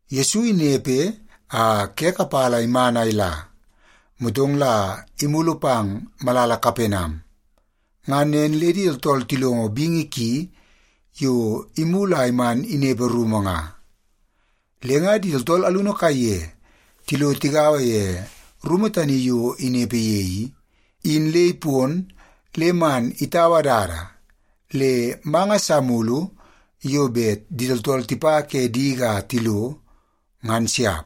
Yesu inepe a ke kapala iman a ila, motong la imulu pang malala Kapenam. Ngan nen le di tooltool tilongo bingi ki yo imulu a man inepe rumu nga. Le nga di tooltool alunu kaiye tilo tigaua ye rumu tani yo inepe ye i, in le ipon le man itaua dada le manga sa mulu yo bet di tooltool tipa ke diki a tilo, ngan siap.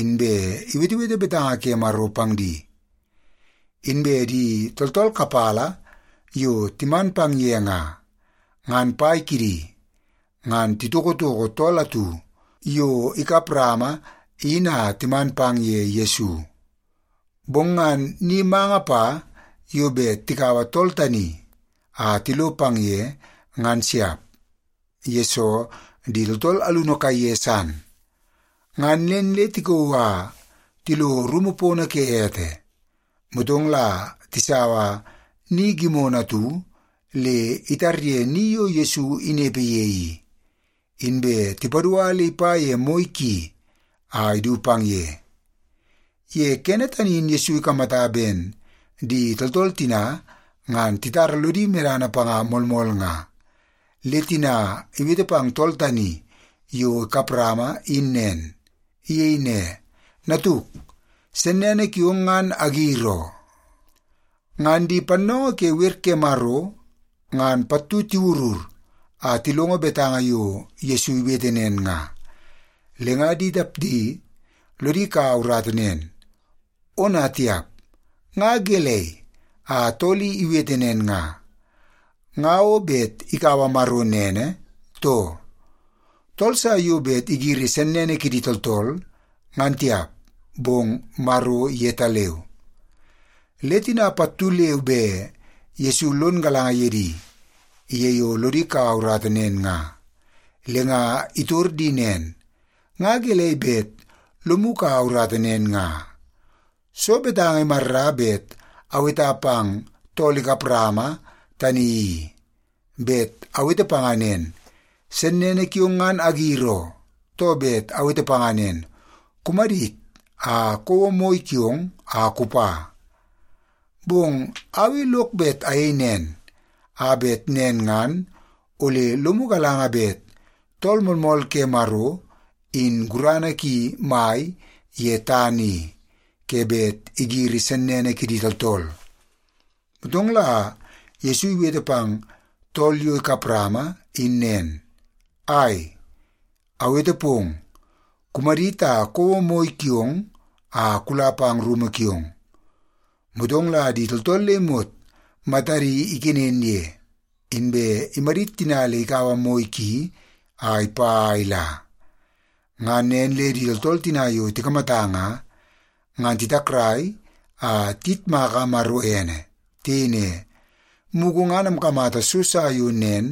Inbe iwetewete betanga ke Maro pang di. Inbe di tooltool kapala yo timan pang ye nga, ngan pai kidi ngan titokotoko tool atu yo ikap rama in a timan pang ye Yesu. Bong ngan ni manga pa yo bet tikaua tool tani a tilo pang ye, ngan siap, yesoo di tooltool alunu kaiye san. Ngan nen le tikauu a tilo rumu pono ke ete, motong la tisaua ni gimono atu le itarye ni yo Yesu inepe ye i, inbe tipadua le ipa ye moi ki a idu pang ye. Ye kene tani in Yesu ikamata ben di tooltool tina ngan titara lodi medana panga moolmool nga, le tina iwete pang tool tani yo ikap rama in nen. Iyei ne, “Natuk, sennene kiong ngan agir oo.” Ngan di pannoongoo ke wer ke Maro ngan pattu tiwurur a tilongo betanga yo Yesu iwete nen nga, le nga di tapdi lodi kaua urata nen, “Ona tiap, nga gelei a tool i iwete nen nga? Nga o bet ikaua Maro nene, too? Tool sa yo bet igiri sennene kidi tooltool ngan tiap, bong Maro yetaleu.” Le tina pattu leu be Yesu lon galanga ye di ye yo lodi kaua urata nen nga, le nga itor di nen, “Nga gelei bet lomu kaua urata nen nga? Soo betanga imarra bet aweta pang tool kap rama tani i? Bet awete panga nen, ‘Sennene kiong ngan agir oo,’ too bet awete panga nen, ‘Kumadit, a kouo moi kiong a kupa’? Bong au i lok bet ayei nen, a bet nen ngan ole lomu galanga bet Tool Moolmool ke Maro in gurana ki mai ye tana i, ke bet igiri sennene kidi tooltool.” Motong la Yesu iwete pang tool yo ikap rama in nen, “Ai, awete pong, kumadit a kouo moi kiong a kula pang rumu kiong.” Motong la di tooltool le imot matadi ikenen ye, inbe imadit tina le ikaua moi ki a ipa a ila. Ngan nen le di tooltool tina yo tikamata nga, ngan titakrai a tiyitmaka Maro ene. Tiyei ne, “Mugu ngan amkamata so sa yo nen,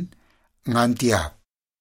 ngan tiap!”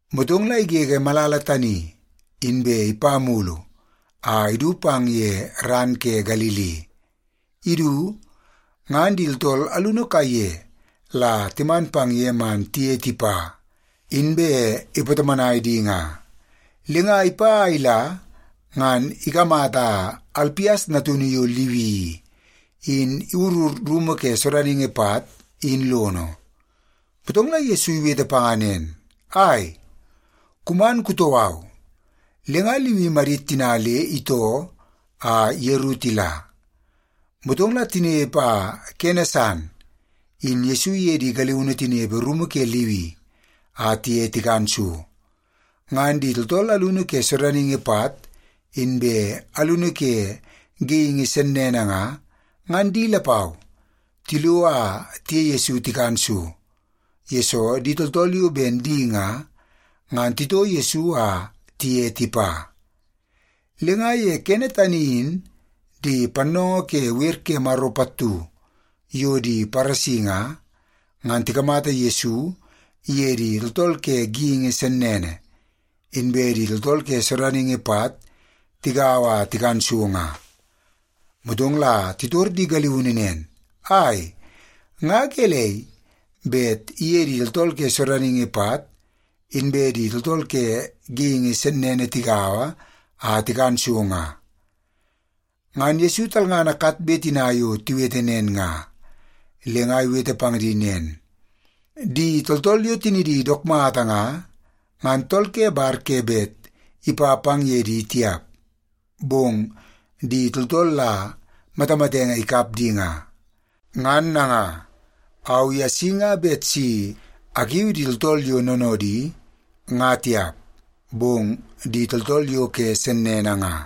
Motong la igege malala tani, inbe ipa mulu a idu pang ye ran ke Galili. Idu, ngan di tooltool alunu kaiye la timan pang ye man tiye tipa, inbe ipatomonai di nga. Le nga ipa a ila ngan ikamata Alpias natunu yo Liwi i, in iwurur rumu ke sodaningi pat in lono. Motong la Yesu iwete panga nen, “Ai, kuman kutoo au.” Le nga Liwi imadit tina le itoo a yeru tila. Motong la tinepe a kene san in Yesu iye di galiunu tinepe rumu ke Liwi a tiye tikan so. Ngan di tooltool alunu ke sodaningi pat, inbe alunu ke geingi sennene nga, ngan di lapau tilo a tiye Yesu tikan so, yesoo di tooltool yo ben di nga, ngan titoo Yesu a tiye tipa. Le nga ye kene tani in di pannoongoo ke wer ke Maro pattu yo di Paresi nga, ngan tikamata Yesu iye di tooltool ke geingi sennene, inbe di tooltool ke sodaningi pat tigaua a tikan so nga. Motong la titor di galiunu nen, “Ai, nga gelei bet iye di tooltool ke sodaningi pat, inbe di tooltool ke geingi sennene tigaua a tikan so nga?” Ngan Yesu talngana katbe tina yo tiwete nen nga, le nga iwete pang di nen, “Di tooltool yo tinidi dook mata nga, ngan tool ke bar ke bet ipa pang ye di tiap, bong di tooltool la matamatenge ikap di nga. Ngan nanga, au i asi nga bet si akiu di tooltool yo noonoodi nga tiap, bong di tooltool yo ke sennene nga.”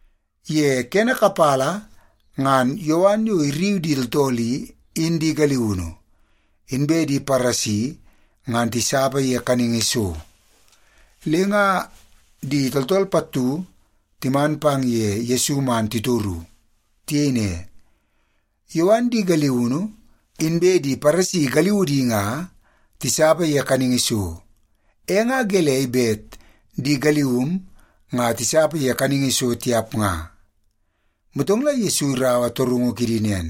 Ye kene kapala ngan Yowan yo irriu di tooltool i, in di galiunu, inbe di Paresi ngan tisapa ye kaningi so. Le nga di tooltool pattu timan ye Yesu man titoru. Tiyei ne, “Yowan di galiunu, inbe di Paresi galiudi nga tisapa ye kaningi so, e nga gelei bet di galium nga tisapa ye kaningi so tiap nga?” Motong la Yesu iraua torungu kidi nen,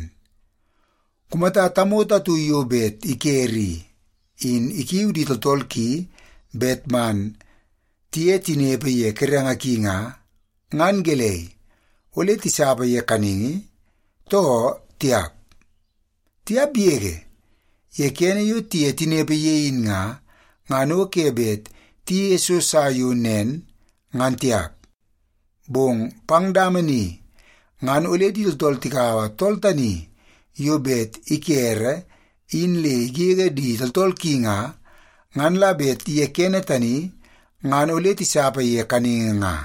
“Kumata tamoto atu yo bet ikere i, in ikiu di tooltool ki bet man tiye tinepe ye kerenge ki nga, ngan gelei, ole tisapa ye kaningi, too tiap? Tiap yege! Ye kene yo tiye tinepe ye in nga, ngan o ke bet tiyeie so sa yo nen, ngan tiap. Bong pang dama ni ngan ole di tooltool tikaua tool tani yo bet ikere in le igege di tooltool ki nga, ngan la bet ye kene tani ngan ole tisapa ye kaningi nga.”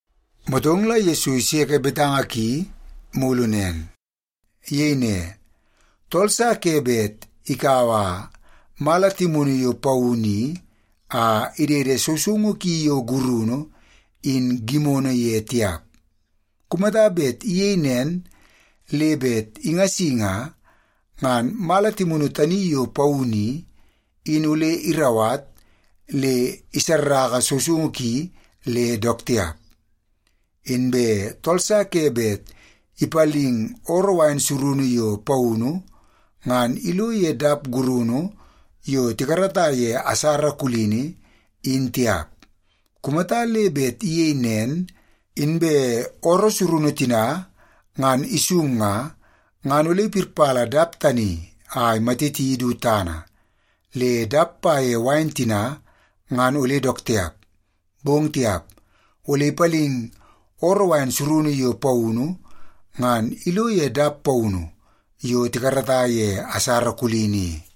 Motong la Yesu iseke betanga ki mulu nen. Iyei ne, “Tool sa ke bet ikaua mala timunu yo paunu i a idede sousoungu ki yo gurunu in gimono ye tiap. Kumata bet iyei nen le bet ingasi nga, ngan mala timunu tani yo paunu i, in ole irauwat le isarraka sousoungu ki le dook tiap. Inbe tool sa ke bet ipaling ooroo wain surunu yo paunu ngan ilo ye dap gurunu yo tikarata ye asara kulini, in tiap. Kumata le bet iyei nen, inbe ooroo surunu tina ngan isung nga, ngan ole ipirpala dap tani a imatiti du tana, le dap pa ye wain tina ngan ole dook tiap. Bong tiap, ole ipaling ooroo wain surunu yo paunu ngan ilo ye dap paunu yo tikarata ye asara kulini i.”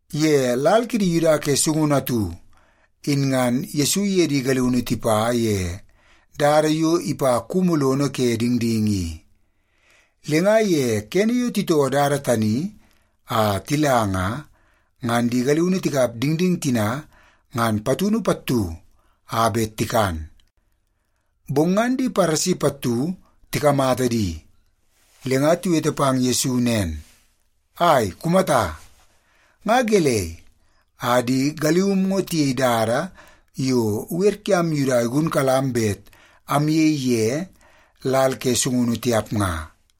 Ye lal kidi Yuda ke sungunu atu in ngan Yesu iye di galiunu tipa ye dada yo ipa kumu lono ke dingding i. Le nga ye kene yo titoo dada tani a tila nga, ngan di galiunu tikap dingding tina ngan puana pattu a bet tikan. Bong ngan di Paresi pattu tikamata di, le nga tiwete pang Yesu nen, “Ai, kumata! Nga gelei a di galium ngo tiyei dada yo wer kiam Yuda igunkalam bet amyei ye lal ke sungunu tiap nga?”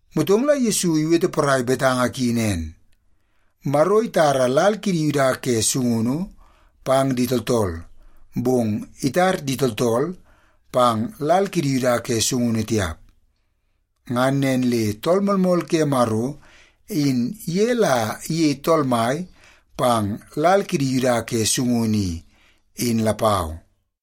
Motong la Yesu iwete porai betanga ki nen, “Maro itara lal kidi Yuda ke sungunu pang di tooltool, bong itar di tooltool pang lal kidi Yuda ke sungunu tiap. Ngan nen le Tool Moolmool ke Maro, in ye la iyei Tool Mai pang lal kidi Yuda ke sungunu i, in lapau.”